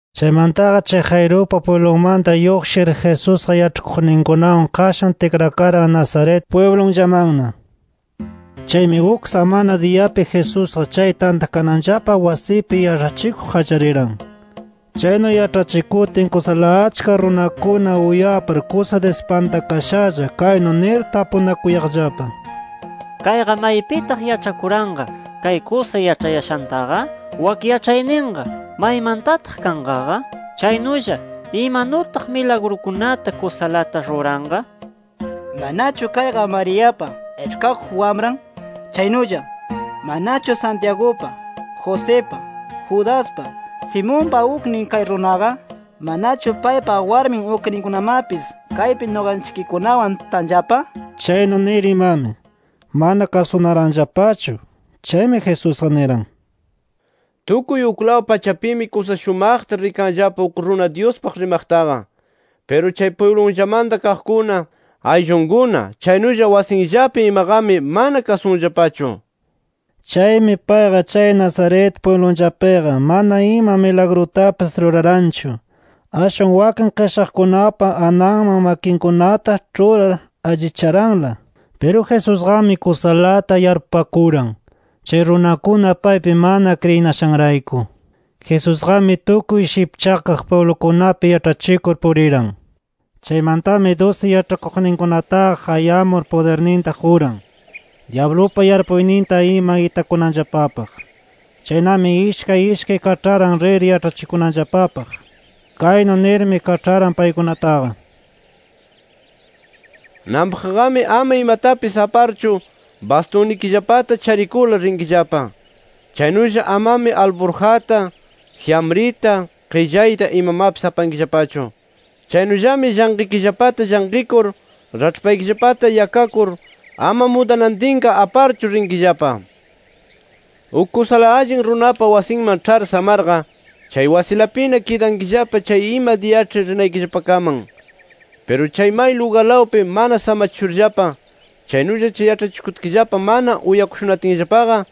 Chaymantaqa chay Jairupa pwiblunmanta lluqshir Jesusqa yaĉhakuqninkunawan qashan tikrakaran Nazaret pwiblullamanna. Chaymi uk samana diyapi Jesusqa chay tantakananllapa wasipi yaĉhachikuq qallariran. Chaynu yaĉhachikutin kusala achka runakuna uyapar kusa dispantakashalla kaynu nir tapunakuyaqllapa: “¿Kayqa maypitaq yaĉhakuranqa kay kusa yaĉhayashantaqa? ¿Wak yaĉhayninqa maymantataq kanqaqa? Chaynulla ¿imanutaq milagrukunata kusalata ruranqa? ¿Manachu kayqa Mariapa, iĉhkakuq wamran? Chaynulla ¿manachu Santiagupa, Josipa, Judaspa, Simonpa uknin kay runaqa? ¿Manachu paypa warmi ukninkunamapis kaypi nuqanchikkunawan tanllapa?” Chaynu nir imami, mana kasunaranllapachu. Chaymi Jesusqa niran: —Tukuy uklaw pachapimi kusa shumaqta rikanllapa uk runa Dyuspaq rimaqtaqa. Piru chay pwiblunllamanta kaqkuna, ayllunkuna chaynulla wasinllapi imaqami mana kasunllapachu nir. Chaymi payqa chay Nazaret pwiblunllapiqa mana ima milagrutapis ruraranchu. Ashwanmi wakin qishaqkunapa ananman makinkunata ĉhurar allicharanla. Piru Jesusqami kusalata yarpupakuran, chay runakuna paypi mana kriyinashanrayku. Jesusqami tukuy shipchakaq pwiblukunapi yaĉhachikur puriran. Chaymantami dusi yaĉhakuqninkunataqa qayamur pudirninta quran, dyablupa yarpuyninta ima itakunanllapapaq. Chaynami ishkay ishkay kaĉharan rir yaĉhachikunanllapapaq. Kaynu nirmi kaĉharan paykunataqa: “Nanpaqqami ama imatapis aparchu, bastunnikillapata charikurla rinkillapa. Chaynulla amami alburjata, jyamrita, qillayta imamapis apankillapachu. Chaynullami llanqikillapata llanqikur, raĉhpaykillapata yakakur ama mudanantinqa aparchu rinkillapa. Chaynullami, uk kusa allin runapa wasinman ĉhar samarqa, chay wasilapina kidankillapa chay ima diyaĉhi rinaykillapakaman. Piru may lugarlawpi mana samachishurllapa chaynulla yaĉhachikutkillapa mana uyakushunatinllapaqa,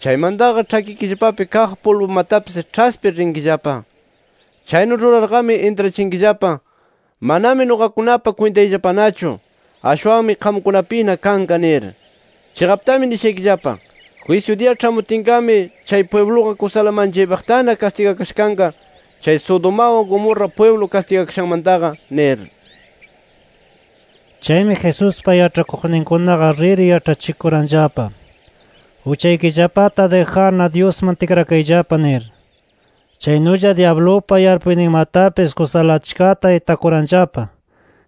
chaymantaqa ĉhakikillapapi kaq pulbumatapis ĉhaspir rinkillapa. Chaynu rurarqami intrachinkillapa: ‘Manami nuqakunapa kwintayllapanachu. Ashwanmi qamkunapina kanqa’ nir. [Chiqaptami nishaykillapa: Jwisyu diya ĉhamutinqami chay pwibluqa kusala manchaypaqtana kastigakasha kanqa chay Sodomawan, Gomorra pwiblu kastigakashanmantaqa nir.]” Chaymi Jesuspa yaĉhakuqninkunaqa rir yaĉhachikuranllapa: Uchaykillapata dijarna Dyusman tikrakayllapa nir. Chaynulla dyablupa yarpuyninmatapis kusala achkata itakuranllapa.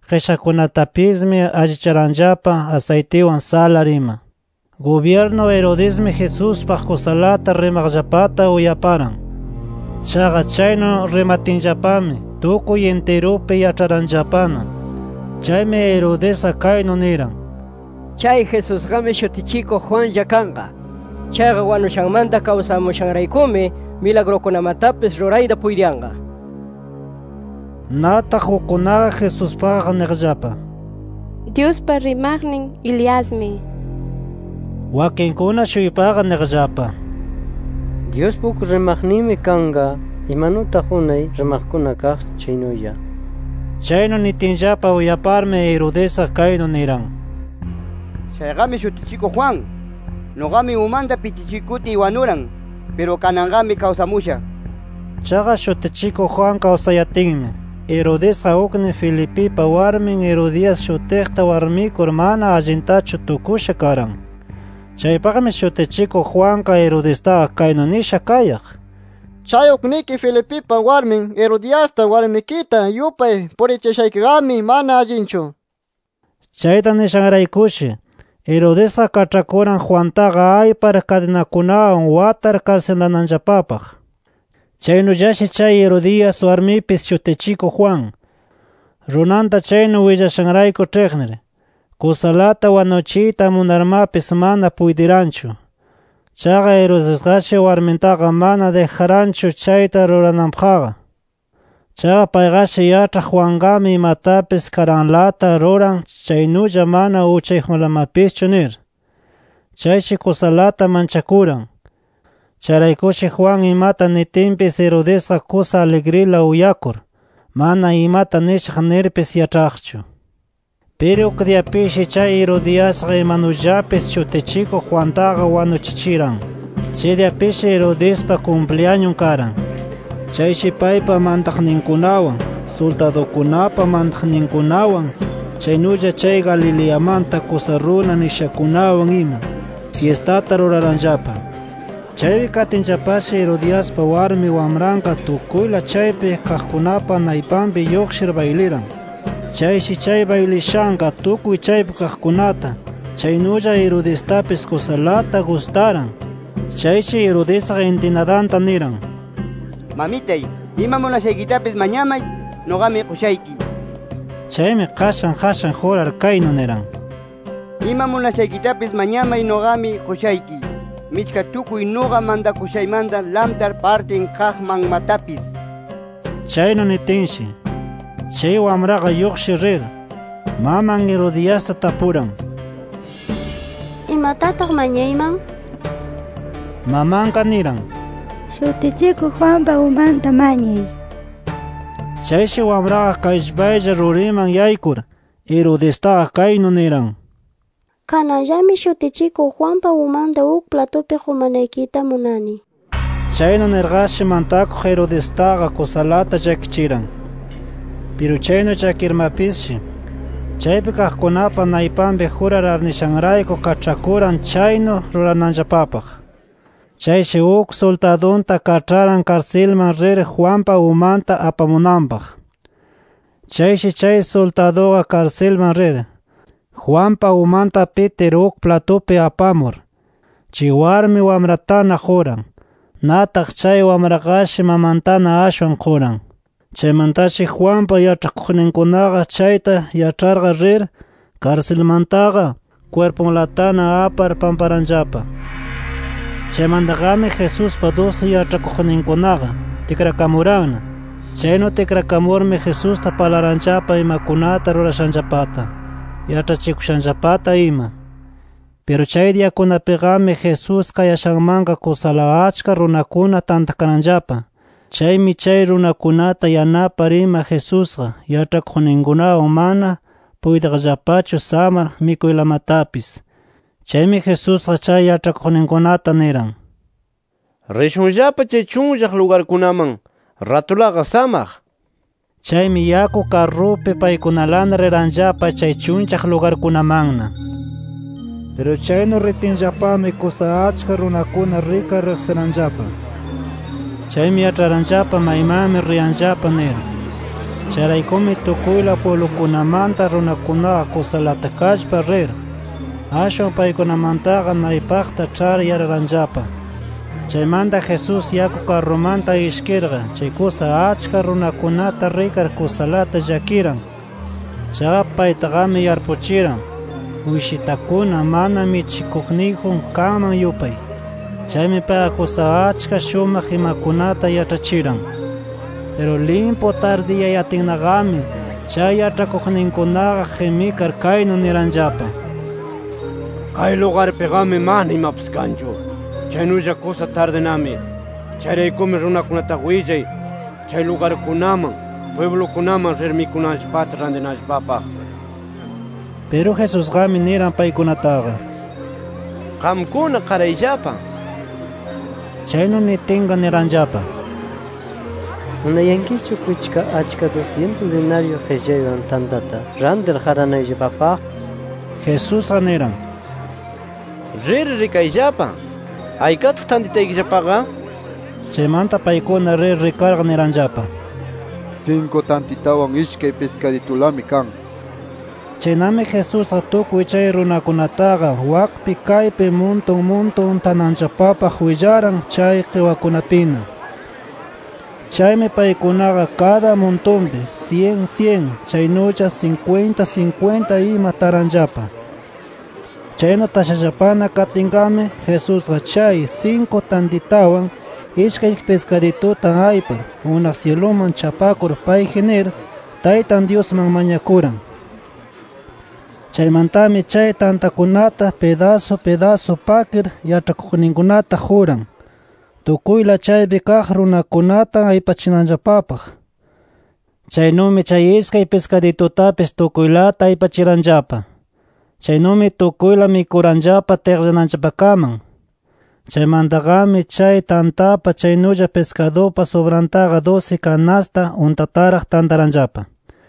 Qishaqkunatapismi allicharanllapa asaytiwan salar ima. Gubyirnu Herodesmi Jesuspaq kusalata rimaqllapata uyaparan. Chaqa chaynu rimatinllapami tukuy intirupi yaĉharanllapana. Chaymi Herodesqa kaynu niran: “Chay Jesusqami, Shutichikuq Juanlla kanqa. Chaqa wanushanmanta kawsamushanraykumi milagrukunamatapis rurayta puytiyanqa” nir. Nataq ukkunaqa Jesuspaqqa niqllapa: “Dyuspa rimaqnin Eliasmi” nir. Wakinkuna-shuypaqa niqllapa: “Dyuspa uk rimaqninmi kanqa, imanutaq unay rimaqkuna kaq chaynulla” nir. Chaynu nitinllapa uyaparmi Herodesqa, kaynu niran: “Chayqami Shutichikuq Juan. Nuqami umanta pitichikutiy wanuran. Piru kananqami kawsamusha” nir. Chaqa Shutichikuq Juan kawsayatinmi, Herodesqa uknin Felipipa warmin Herodias shutiqta warmikur mana allintachu tukusha karan. Chaypaqmi Shutichikuq Juanqa Herodestaqa kaynu nisha kayaq: “Chay ukniki Felipipa warmin Herodiasta warmikita yupay purichiyashaykiqami mana allinchu” nir. Chayta nishanraykushi, Herodesqa kaĉhakuran Juantaqa aypar kadinakunawan watar karsilananllapapaq. Chaynullashi chay Herodias warmipis Shutichikuq Juan, runanta chaynu willashanrayku ĉhiqnir, kusalata wanuchiyta munarmapis mana puytiranchu. Chaqa Herodesqashi warmintaqa mana dijaranchu chayta rurananpaqqa. Chaqa payqashi yaĉhaq Juanqami imatapis karanlata ruran chaynulla mana uchayjunlamapischu nir. Chayshi kusalata manchakuran. Chayraykushi Juan imata nitinpis Herodesqa kusa aligrila uyakur, mana imata nishaq nirpis yaĉhaqchu. Piru uk diyapishi chay Herodiasqa imanullapis Shutichikuq Juantaqa wanuchichiran. Chay diyapishi Herodespa kumpliyañun karan. Chayshi paypa mantaqninkunawan, suldadukunapa mantaqninkunawan, chaynulla chay Galileamanta kusa runa nishakunawan ima fyistata ruraranllapa. Chaypi katinllapashi Herodiaspa warmi wamranqa tukuyla chaypi kaqkunapa naypanpi lluqshir bayliran. Chayshi chay baylishanqa tukuy chaypi kaqkunata chaynulla Herodestapis kusalata gustaran. Chayshi Herodesqa intinadanta niran: —Mamitay, ima munashaykitapis mañamay, nuqami qushayki nir. Chaymi qashan qashan jurar kaynu niran: —Ima munashaykitapis mañamay, nuqami qushayki, michka tukuy nuqa mantakushaymanta lamtar partin kaqmanmatapis nir. Chaynu nitinshi, chay wamraqa lluqshir rir, maman Herodiasta tapuran: —¿Imatataq mañayman? nir. Mamanqa niran: —Shutichikuq Juanpa umanta mañay nir. Chayshi wamraqa kallpaylla ruriman yaykur, Herodestaqa kaynu niran: —Kananllami Shutichikuq Juanpa umanta uk platupi qumanaykita munani nir. Chaynu nirqashi mantakuq Herodestaqa kusalata llakichiran. Piru chaynu llakiyarmapisshi, chaypi kaqkunapa naypanpi jurar arnishanrayku kaĉhakuran chaynu rurananllapapaq. Chayshi uk suldadunta kaĉharan karsilman rir Juanpa umanta apamunanpaq. Chayshi chay suldaduqa karsilman rir, Juanpa umanta pitir uk platupi apamur, chay warmi wamratana quran. Nataq chay wamraqashi mamantana ashwan quran. Chaymantashi Juanpa yaĉhakuqninkunaqa chayta yaĉharqa rir, karsilmantaqa kwirpunlatana apar pamparanllapa. Chaymantaqami Jesuspa dusi yaĉhakuqninkunaqa, tikrakamuranna. Chaynu tikrakamurmi Jesusta parlaranllapa imakunata rurashanllapata, yaĉhachikushanllapata ima. Piru chay diyakunapiqami Jesús kayashanmanqa kusala achka runakuna tantakaranllapa. Chaymi chay runakunata yanapar ima Jesusqa yaĉhakuqninkunawan mana puytiqllapachu samar mikuylamatapis. Chaymi Jesusqa chay yaĉhakuqninkunata niran: —Rishunllapa chay chunllaq lugarkunaman, ratulaqa samaq nir. Chaymi yaku karrupi paykunalana riranllapa chay chunllaq lugarkunamanna. Piru chaynu ritinllapami kusa achka runakuna rikar riqsiranllapa. Chaymi yaĉharanllapa maymanmi riyanllapa nir. Chayraykumi tukuyla pwiblukunamanta runakunaqa kusalata kallpar rir, ashwan paykunamantaqa naypaqta ĉhar yararanllapa. Chaymanta Jesús yaku karrumanta ishkirqa chay kusa achka runakunata rikar kusalata llakiran. Chaqa paytaqami yarpuchiran, uyshitakuna mana michikuqniyjun kanman yupay. Chaymi payqa kusa achka shumaq imakunata yaĉhachiran. Piru limpu tardiyayatinnaqami chay yaĉhakuqninkunaqa qimikar kaynu niranllapa: —Kay lugarpiqami mana imapis kanchu. Chaynulla kusa tardinami. Chayraykumi runakunataqa willay chay lugarkunaman, pwiblukunaman rir mikunanllapata rantinanllapapaq nir. Piru Jesusqami niran paykunataqa: —Qamkuna qarayllapa nir. Chaynu nitinqa niranllapa: —¿Munayankichu kwichka achka dusyintus dinaryu qillaywan tantata rantir qaranayllapapaq? nir. Jesusqa niran: —¡Rir, rikayllapa! ¿Aykataq tantitaykillapaqa? Chaymanta paykuna rir rikarqa niranllapa: —Sinku tantitawan, ishkay piskaditulami kan nir. Chaynami Jesusqa tukuy chay runakunataqa wakpi kaypi muntun muntun tananllapapaq willaran chay qiwakunapina. Chaymi paykunaqa kada muntunpi syin, syin; chaynulla sinkwinta, sinkwinta ima taranllapa. Chaynu tashallapana katinqami, Jesusqa chay sinku tantitawan, ishkay piskadituta aypar unaq syiluman chapakur payji nir, Taytan Dyusman mañakuran. Chaymantami chay tantakunata pidasu pidasu pakir yaĉhakuqninkunata quran tukuyla chaypi kaq runakunata aypachinanllapapaq. Chaynumi chay ishkay piskaditutapis tukuylata aypachiranllapa. Chaynumi tukuyla mikuranllapa tiqllananllapakaman. Chaymantaqami chay tantapa chaynulla piskadupa subrantaqa dusi kanasta untataraq tantaranllapa.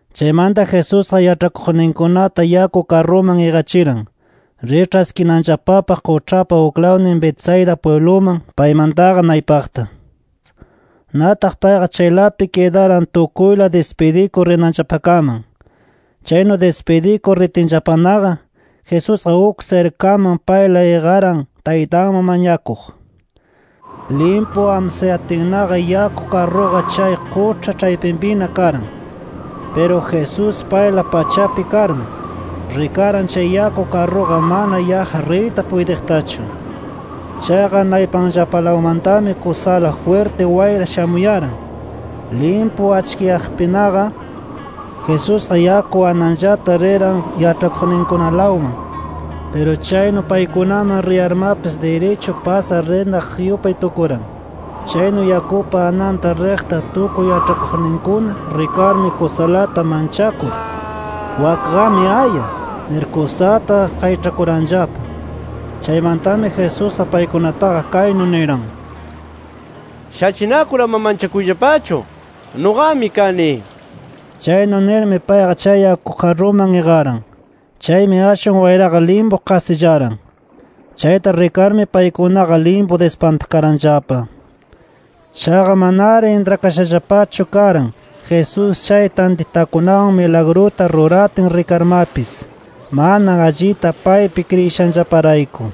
Chaymanta Jesusqa yaĉhakuqninkunata yaku karruman iqachiran, rir ĉhaskinanllapapaq quĉhapa uklawnin Betsaida pwibluman paymantaqa naypaqta. Nataq payqa chaylapi kidaran tukuyla dispidikur rinanllapakaman. Chaynu dispidikur ritinllapanaqa, Jesusqa uk sirkaman payla iqaran Taytanman mañakuq. Limpu amsayatinnaqa yaku karruqa chay quĉha ĉhaypipina karan. Piru Jesús payla pachapi karmi, rikaran chay yaku karruqa mana yaqqa riyta puytiqtachu. Chaqa naypanllapalawmantami kusala jwirti wayra shamuyaran. Limpu achkiyaqpinaqa, Jesusqa yaku ananllata riran yaĉhakuqninkunalawman. Piru chaynu paykunaman riyarmapis, dirichu pasar rinaq yupay tukuran. Chaynu yakupa ananta riqta tukuy yaĉhakuqninkuna rikarmi, kusalata manchakur “¡Wakqami aya!” nir kusata qayĉhakuranllapa. Chaymantami Jesusqa paykunataqa kaynu niran: —¡Shachinakur ama manchakuyllapachu! ¡Nuqami kani! nir. Chaynu nirmi, payqa chay yaku karruman iqaran. Chaymi ashwan wayraqa limpu qasillaran. Chayta rikarmi paykunaqa limpu dispantakaranllapa. Chaqa manari intrakashallapachu karan Jesús chay tantitakunawan milagruta ruratin rikarmapis, mana allita paypi kriyishanllaparayku.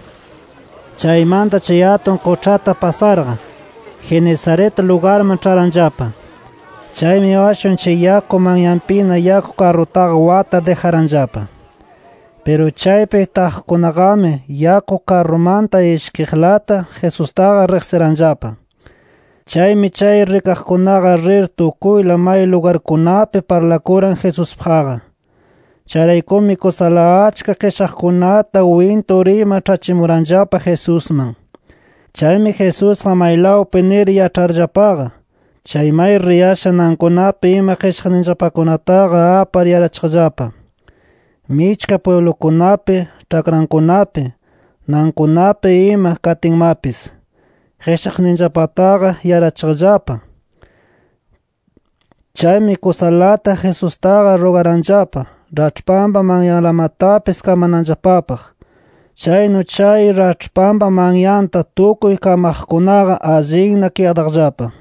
Chaymanta chay atun quĉhata pasarqa, Genesaret lugarman ĉharanllapa. Chaymi ashwan chay yaku manyapina yaku karrutaqa watar dijaranllapa. Piru chaypi taqkunaqami yaku karrumanta ishkiqlata Jesustaqa riqsiranllapa. Chaymi chay rikaqkunaqa rir tukuyla may lugarkunapi parlakuran Jesuspaqqa. Chayraykumi kusala achka qishaqkunata wintur ima ĉhachimuranllapa Jesusman. Chaymi Jesusqa maylawpi nir yaĉharllapaqa, chay may riyashan nankunapi ima qishaqninllapakunataqa apar yarachiqllapa. Michka pwiblukunapi, ĉhakrankunapi, nankunapi ima katinmapis, qishaqninllapataqa yarachiqllapa. Chaymi kusalata Jesustaqa rugaranllapa raĉhpanpa manyanlamatapis kamananllapapaq. Chaynu chay raĉhpanpa manyanta tukuy kamaqkunaqa allinna kidaqllapa.